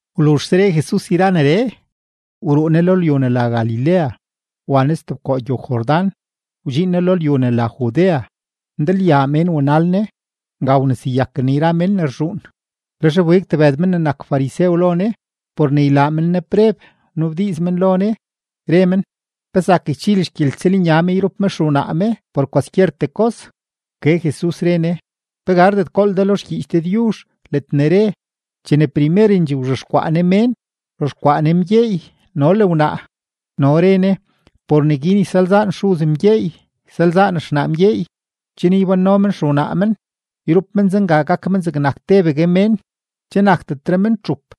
Wluzhse re Jesus yra neree, wruu Ne lo lyu ne la Galilea wa Ne stebkoo gyow-Jordán wdxiin Ne lo lyu ne la Judea. Ndalyaa mén wanal Ne; nga wneseyaken Ne yra mén ne rzhuun. Lex wbig tebëd men ne nak farisew lo Ne por ne ylaa men Ne preb; wnabdiiz men lo Ne, re men: ―¿Pe zak ychil xgyeltsëlnya me yrup me xewnaa me por kwaskyertee kos? Wke Jesus, re Ne: ―¿Pe gardet gool de lo xgyiich Dëdyuzh ledne re, chene primerendxee wzhexkwaa Ne mén, “wzhexkwaa Ne mgyeey no le wnaa”? No re Ne: “Por neguin ysalzaan xuz mgyeey, ysalzaan xnaa mgyeey, chen ybánno men xewnaa men, yrup men zenga gak men zegnak tebegue mén.” Che nakdetre men txup,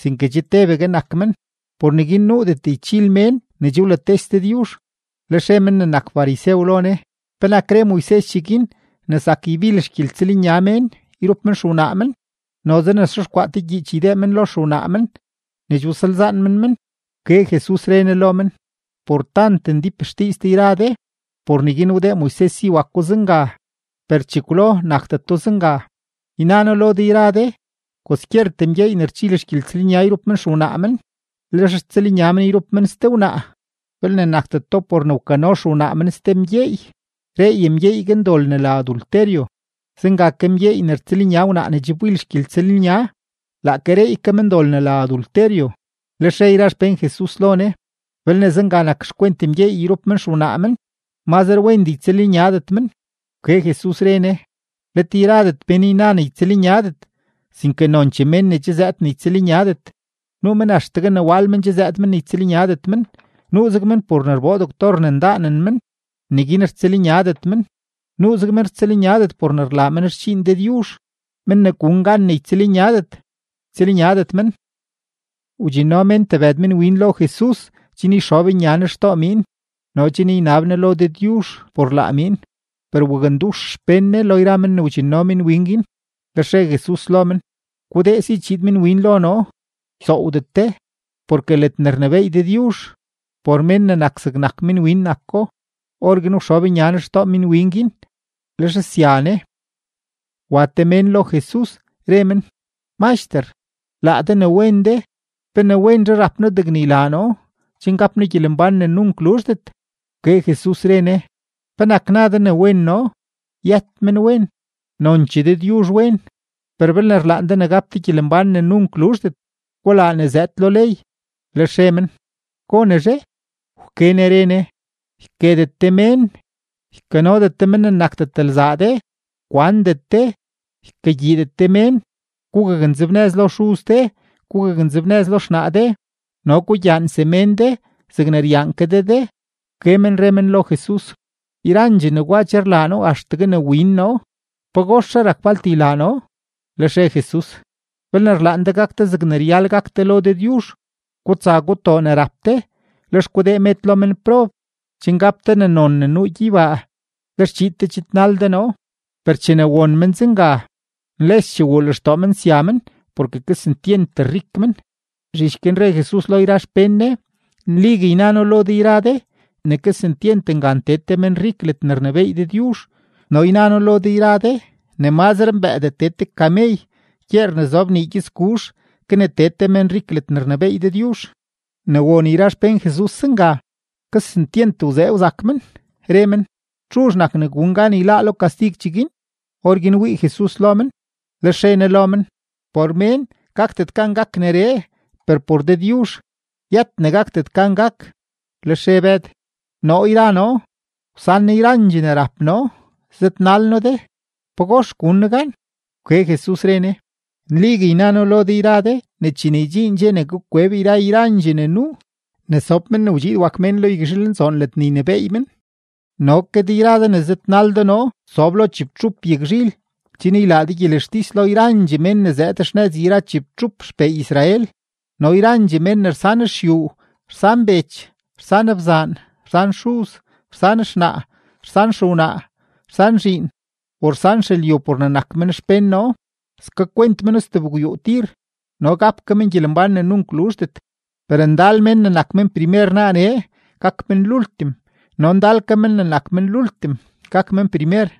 sinke che tebegue nak men. Por neguin nuudet ychil mén ne che wlates Dëdyuzh. Lex re men ne nak farisew lo Ne: ―¿Penak re Moises cheguin ne zak ybil xgyeltsëlnya mén yrup men xewnaa men, noze ne xexkwaa te gyiich ydee men lo xewnaa men ne che wsalzaan men men? Wke Jesus, re Ne lo men: ―Por tant ndíp xdiiz de yra de, por neguin wdee Moises si wako zenga; per chekwlo nakdeto zenga. Yna noo lo de yra de, kwaskyertee mgyeey ne rchil xgyeltsëlnya yrup men xewnaa men, lex rtsëlnya men yrup men ste wnaa, belne nakdeto por ne wkano xewnaa men ste mgyeey, reey mgyeey guin dol ne la adulterio. Zenga ke mgyeey ne rtsëlnya wnaa ne che wbil xgyeltsëlnya, laake reey ke men dol ne la adulterio. Lex re yra xpén Jesus lo Ne: ―Belne zenga nak xkwent mgyeey yrup men xewnaa men, mazre wendee ytsëlnyadet men. Wke Jesus, re Ne: ―Let yradet mén yna ne ytsëlnyadet, sinke nonchee mén ne che zëëd ne ytsëlnyadet. Nuu mén axtegue ne wal men che zëëd men ne ytsëlnyadet men, nuuzeg men por ne rboo doctor ne ndaanen men neguin rtsëlnyadet men, nuuzeg men rtsëlnyadet por ne rlaa men xdxiin Dëdyuzh. Men ne gun gan ne ytsëlnyadet, ytsëlnyadet men. Wdxinno mén tebëd minwin lo Jesus chen yxob nya Ne xtoo miin no chen ynab Ne lo Dëdyuzh por laa miin; per wakndux xpén Ne lo yra men ne wdxinno minwin guin. Lex re Jesus lo men: ―Gudee si chiid minwin lo noo, ysoowdet de, porke ledne rnebééy Dëdyuzh, por mén ne nak zegnak minwin nako. Orguin wxob nya Ne xtoo minwin guin, lex sya Ne. Wa te mén lo Jesus, re men: ―Maxter, laa de ne wen de, ¿pe ne wenzhe rap noo degne ylaa noo chen gap noo gyelembán ne nunk luzhdet? Wke Jesus, re Ne: ―¿Penak na de ne wen noo? Yët menwen; nonchee Dëdyuzh wen. Per belne rlaan de ne gap de gyelembán ne nunk luzhdet, gulaa ne zëëd lo ley. Lex re men: ―¿Gonezhe? Wke Ne re Ne: ―Yketet de mén, ykanodet de mén ne nakdet lzaa de, kwandet de, ykagyiidet de mén, gugaknzebnëz lo xuz de, gugaknzebnëz lo xnaa de, no gugyaan semén de zegne ryaan ke de de. Wke men re men lo Jesus: ―Yrandxee negwa che rlaa noo axtegue ne win noo; ¿pagoxre rak falt ylaa noo? Lex re Jesus: ―Belne rlaan de gak de zegne ryal gak de lo Dëdyuzh, gutsa gutoo ne rap de, lex gudee med lo menprob, chen gap de ne non ne nuu gyeybaa; lex chiid de chidnal de noo. Per chene won men zenga, nleschee wuu lextoo men sya men, porke kesentyent rik men. Zhich guin re Jesus lo yra xpén Ne: ―Nligue yna noo lo de yra de ne kesentyent ngan tee te menrik ledne rnebééy Dëdyuzh. No yna noo lo de yra de ne mazre mbëëdee tee te kamey gyeer ne zob nii gyëtsguzh ke ne tee te menrik ledne rnebééy Dëdyuzh. Ne won yra xpén Jesus zenga, kesentyent wzee wzak men, re men: ―¿Txuzh nak ne gun gan yláá lo kastig cheguin? Orguin wii Jesus lo men, lex re Ne lo men: ―Por mén gakdet gan gak neree, per por Dëdyuzh yët ne gakdet gan gak. Lex re Bëd: ―Noo yra noo, wsan noo yrandxee ne rap noo, zëdnal noo de. ¿Pagox gun noo gan? Wke Jesus, re Ne: ―Nligue yna noo lo de yra de ne chene ydxiin dxe ne gak kweb yra yrandxee ne nuu, ne sob Men ne wdxiid wak Mén lo yagzhilnzoon ledne ynebééy men, no ke de yra de ne zëdnal de noo sob lo chibtxup yagzhil chen ylaa de gyelextis lo yrandxee men ne zëëd xnëz yra chibtxup xpee Israel. No yrandxee mén ne rsan xyuu, rsan bech, rsan bzaan, rsan xuz, rsan xnaa, rsan xewnaa, rsan zhiin, o rsan xelyu por ne nak men xpén noo, skakwent meno stebgwyuu tir no gap ke men gyelembán ne nunk luzhdet. Per ndal men ne nak men primer naaree, gak men lultim; no ndal ke men ne nak men lultim, gak men primer.